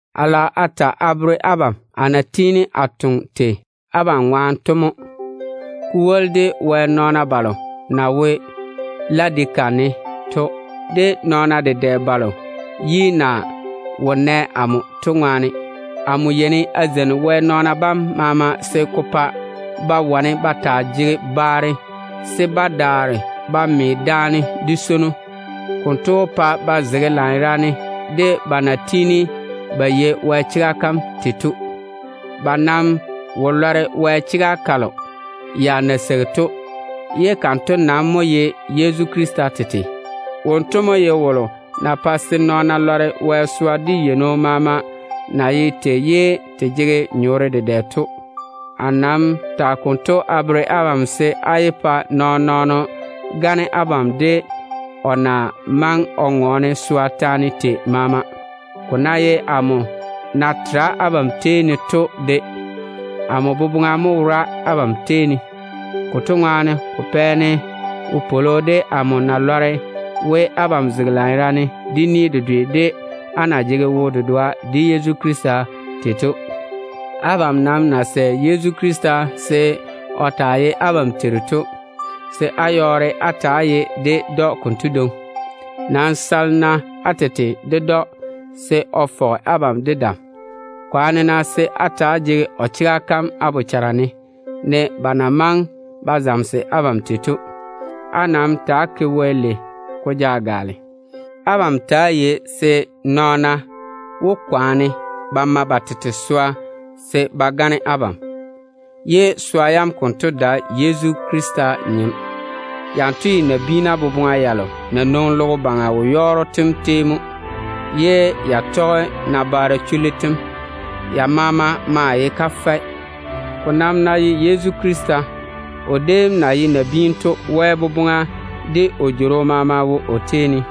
A lage a ta a bere abam amo na tiini a toŋe tei abam ŋwaane to mo. A ta toŋe a pa Wɛ nɔɔna balo na wo Ladika ne to, de nɔɔna balo yi na wo nɛ amo to maama. Amo yeini a zeini Wɛ nɔɔna bam se ko pa ba wane ba taa jege baare, se ba daare ba me daane de swono. Konto wó pa ba zege lanyerane de ba na tiini ba yei Wɛ chega kam tei to. Ba maa wó ba ba lɔre Wɛ chega kalo ya na seigi to, ye kanto nam mo ye Yezu Krista tete. Wonto mo ye wolo na pae se nɔɔna wane ba lɔre Wɛ swa de yeino maama na ye tei, ye te jege nyɔɔre dedɛ to. A nam tage konto a bere abam se á yé pa nɔɔn-nɔɔno gane abam, de o ná maŋe o ŋɔɔne swa taane tei maama de. Amo na seene a tera abam tei ne to, amo boboŋa mo wora abam tei ne. Konto ŋwaane, ko pɛ-ne wopwolo de amo na lɔre we, abam zege lanyerane de ni dedwe de á na yɔɔre á jege wo-dedoa de Yezu Krista tei to. Abam nam na sɛ Yezu Krista se o taa ye abam Teiru to, se á yɔɔre á ta‑á ye ded‑o konto dwoŋi. Nam sale-na á tete ded‑o se o fɔge abam de dam. Kwaane-na se á ta‑á jege o chega kam á bochara ne, ne ba na maŋe ba bere abam tei to. Á nam ta‑á ke Wɛ lei se ko gaale. Abam ta‑á yei se nɔɔna wó kwaane ba ma ba tete swa ba gane abam, ye swa yam konto dae Yezu Krista nyem. Ya nam ye nabiina boboŋa yalo na tɔge logo baŋa wo-yɔɔro tem dedaane dé nabaara chullu tem ŋwaane mo. Ya maama maa ye kafɛ. Ko nam ná ye Yezu Krista, o déem na ye nabiinu to, Wɛ boboŋa de o jworo maama wo o tei ne.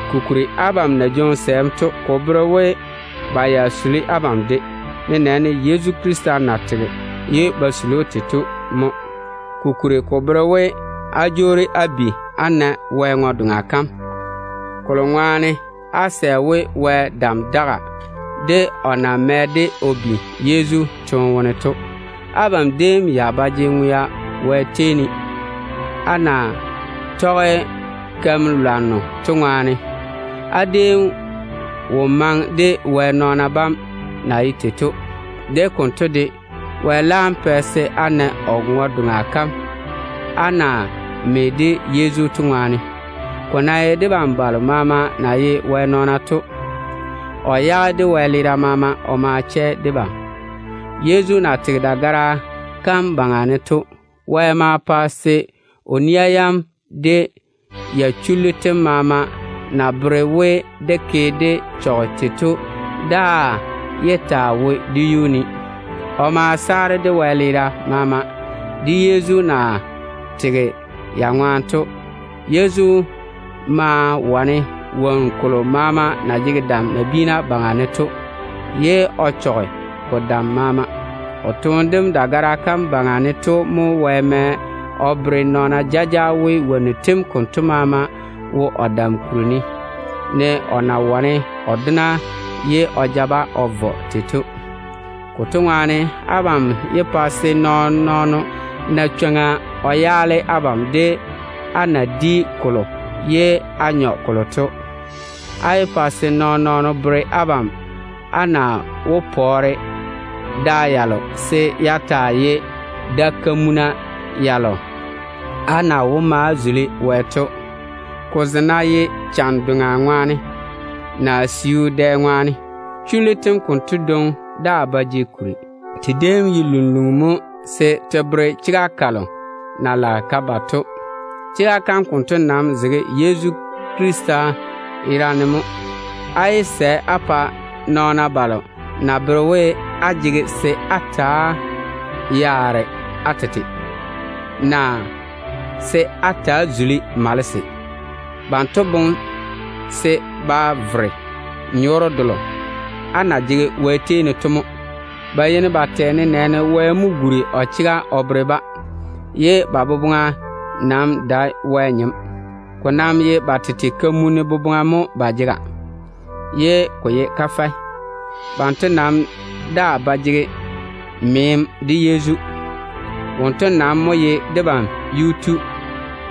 Kokuri, abam na jwoŋi sɛɛm to, ko bere we ba ya suli abam de, nenɛɛne Yezu Krista na tega ye ba suli‑o tei to mo. Ko kwori ko bere we, á jwoori á bi á na Wɛ ŋwe-doŋa kam, kolo ŋwaane á sɛ we Wɛ dam daga, de o na mɛ-de o bi Yezu toone wone to. Abam déem ya ba jege ŋwea Wɛ tei ne, á na tɔge keim-balwaaro to ŋwaane. Á déem wo maŋe de Wɛ nɔɔna bam na ye tei to. De konto de, Wɛ laam pɛ se á na o ŋwe-doŋa kam, á na me de Yezu to ŋwaane. Ko ná ye debam balo maama na ye Wɛ nɔɔna to, o yage dé wɛleera maama o ma chɛ debam. Yezu na tege dagara kam yuu ne to, Wɛ ma pa se o nia yam de ya chullu tem maama na bere we dé ke dé chɔge tei to daa yé taa wo dé yuu ne. O ma saare dé wɛleera maama, Yezu na leiri dé yuu ne o te to ŋwaane. Yezu ma wane dedɛɛra balo maama na jege dam nabiina baŋa ne to, ye o chɔge ba dam maama. O toone dem dagara kam yuu ne to mo Wɛ mɛ o bere nɔɔna jaja we, dedɛɛra bam konto maama wo o dam kuri ne, ne o na wane o dona ye o ja-ba o vɔ tei to. Konto ŋwaane, abam yé pa se nɔɔn-nɔɔno na chwoŋa o yaale abam de á na di kolo ye á nyɔ kolo to. Á yé pa se nɔɔn-nɔɔno bere abam á na wó pɔɔre da yalo se ya taa ye da-kamuna yalo á na wó ma á zuli Wɛ to, ko ze ná ye chan-doŋa ŋwaane, naa siu dɛ ŋwaane. Chullu tem konto dwoŋi daa ba jege kuri. Te déem ye lunluŋu mo se te wuuri te bere chega kalo na lage ka ba to. Chega kam konto nam zege Yezu Krista yera ne mo. Á yé sɛ á pa nɔɔna balo na bere we, á jege se á ta‑á yaare á tete, naa se á ta‑á zuli malese. Banto boŋe se ba vere nyɔɔre delo á na jege Wɛ tei ne to mo. Ba yeini ba tɛ nenɛɛne, Wɛ mo guri o chega o bere-ba, ye ba boboŋa nam dae Wɛ nyem. Ko nam ye ba tete kamunim boboŋa mo ba jega, ye ko ye kafɛ. Banto nam daa ba jege meem de Yezu. Wonto nam mo ye debam Yuu-tu,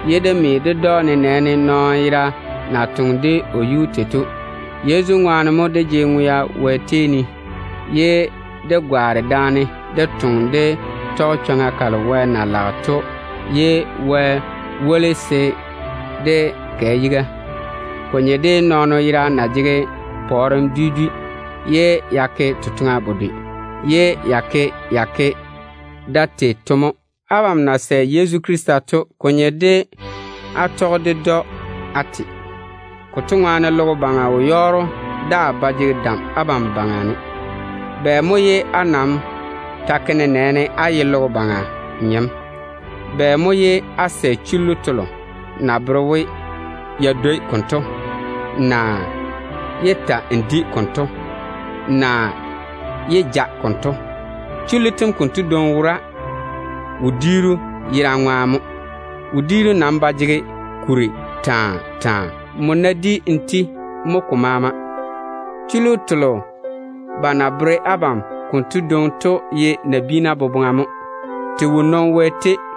ye dé me ded‑o nenɛɛne nɔɔno yera na twoŋi de o yuu tei to. Yezu ŋwaane mo dé jege ŋwea Wɛ tei ne, ye dé gwaane daane dé toŋa dé tɔge chwoŋa kalo Wɛ na lage to. Wɛ maa woli debam se dé toŋe dé vo yiga. Ko nye de nɔɔno yera na jege pɔɔrem dwi dwi, ye ya ke totoŋa bedwe, ye ya ke ya ke da tei to mo. Abam na sɛ Yezu Krista to, ko nye de á tɔge ded‑o á te. Konto ŋwaane logo baŋa wo-yɔɔro daa ba jege dam á baŋa ne. Bɛ mo ye á nam ta ke nenɛɛne á ye logo baŋa nyem? Bɛ mo ye á sɛ chullu telo na bere we, “Yé dwei konto”, naa “Yé ta‑n di konto”, naa “Yé ja konto”? Chullu tento dwoŋi wora wodiiru yerane ŋwaane mo. Wodiiru nam ba jege kuri taa taa. Nmo ná di n ti, mo ko maama. Chullu telo ba na bere abam konto dwoŋi to ye nabiina boboŋa mo. Te wo nwoŋi Wɛ tei.